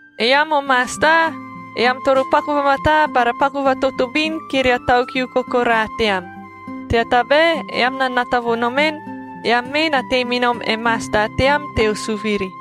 Eam o masta, eam toro paku vamataa bara paku vatotobin kiria tau kiu kokoraa team, tea tabae eam na nata vo nomen, eam mee na tei me nom e Masta team teo suviri.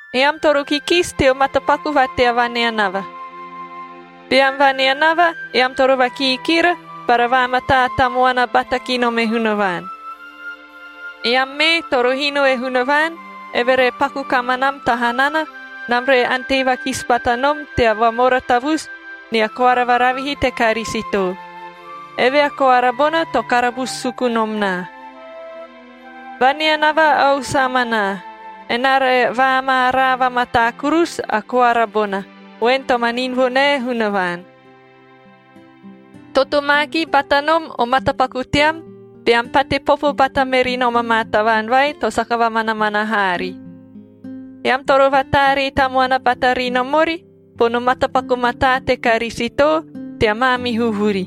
Eam toro kikisi teo matapaku va tea vaneanava. Beam vaneanava, eam toro vakiikira bara vaamataa tamuana bata ki nom e Hunavaan. Eam mee toro hino e Hunavaan, eve re paku kamanam ta hanana, enam re ante vakisi bata nom tea vamora tavusu nia koara varavihi te Karisito. Eve a koara bona to karabusu suku nom naa. Vaneanava ausu amanaa, enaa re vaamaaraa vamataa kurusu a koara bona, voen to manin vo nae Hunavaan. Totomaakia bata nom o matapaku team beam pate popo bata meri nom amaa tavaan vai to saka vamanamana haari. Eam toro vataaree tamuana bata ri nom ori bono matapaku mataa te Karisito tea maamihu vuri.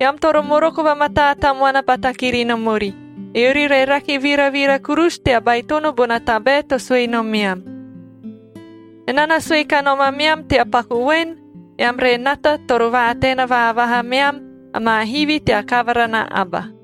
Eam toro moroko vamataa tamuana bata kiri nom ori, eori re rake viravira kurusu tea baitono bona tabae to sue nomeam. Enaa na sue kanom ameam tea paku voen, eam re nata toro vaataena vaavaha meam amaa hivi tea kavara na aba.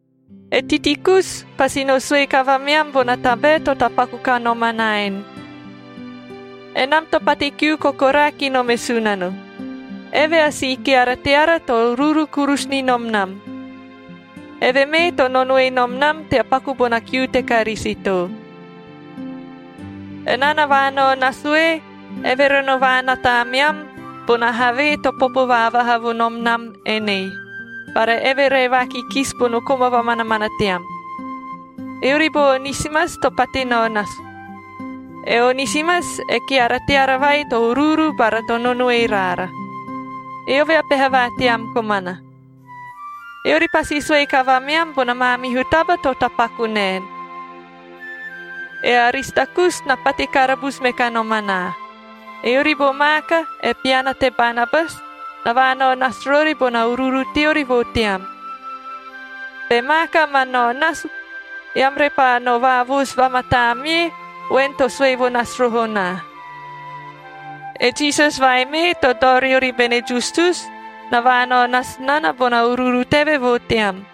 E Tikikus pasi no sue kavameam bona tabae to tapaku kanom anaa en. Enam to pate kiu kokoraa ki nom e Sunano. Eve a si keara teara, to uruuru kurusu ni nom nam. Eve mee to nonoe nom nam tea paku bona kiu te Karisito. Enaa na vaanao nasu ee, eve re no vaanata ameam bona havee to popo vaavaha vo nom nam enei, bara eve re vaakikisi bono koma vamanamana team. Eori bo Onisimas to pate nao nasu. E Onisimas e keara teara vai to uruuru bara to nonoe raara. Eove a peha va team komana. Eori pasi sue kavameam bona maamihu taba to tapaku naen. E Aristakus na pate karabusu me kanom anaa; eori bo Maaka, e piana te Banabas, na vaanao nasu rori bona uruuru teori vo team. Be Maaka ma nao nasu, eam repaa no vaavoosu vamataa mie voen to sue vo nasu roho naa. E Jisas vai mee, to dao riori bene Justus, na vaanao nasu nana bona uruuru teve vo team.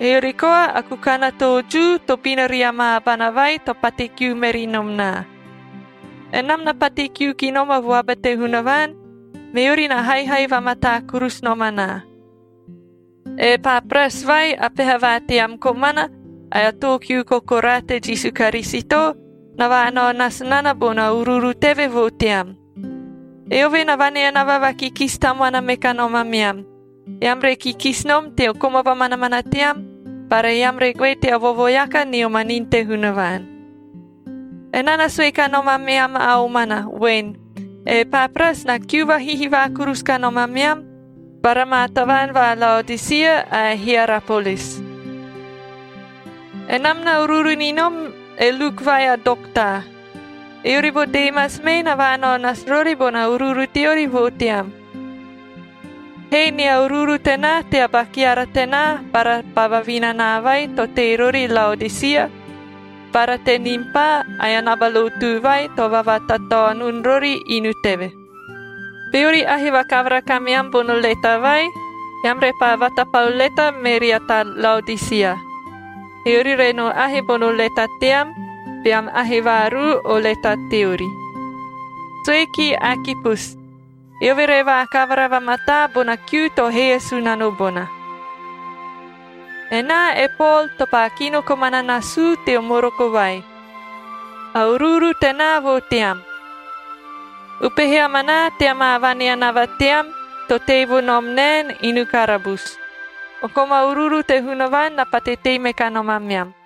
Eori koa a kukan a too Jiu tobina ria maa abana vai to pate kiu meri nom naa. Enam na pate kiu ki nom a vuaba te Hunavaan, meori na haihai vamataa kurusu nom anaa. E Epapras, vai a peha va team komana ae a too kiu kokoraa te Jisu Karisito, na vaanao nasu nana bona uruuru teve vo team. Eove na vaneanava vakikisi tamuana me kanom ameam, eam re kikisi nom teo koma vamanamana team bara eam re goe tea vovoeaka nio manini te Hunavaan. Enaa na sue kanom ameam a omana voen, e Epapras na kiu vahihivaa kurusu kanom ameam bara maa tavaan va Laodisia ae Hierapolis. Enam na uruuru ni nom e Luk vai a dokta. Eori bo Demas mee na vaanao nasu rori bona uruuru teori vo team. Hee nia uruuru tenaa tea ba keara tenaa bara ba vavinanaa vai to tei rori Laodisia, bara te Nimpa ae naba lotu vai to vavatataonun rori inu teve. Beori ahe vakavara kameam bono leta vai, eam repaa vatapau leta me ria ta Laodisia, eori re no ahe bono leta team beam ahe vaaruu o leta teori. Sue kie Akipus, eove re vaakavara vamataa bona kiu to hee e Sunano bona. Enaa e Pol to paa kino komana nasuu teo moroko vai: ‘A uruuru tenaa vo team.’ Upehe amanaa tea maa vaneanava team to tei vo nom naen inu karabusu. O koma uruuru te Hunavaan na pate tei me kanom ameam.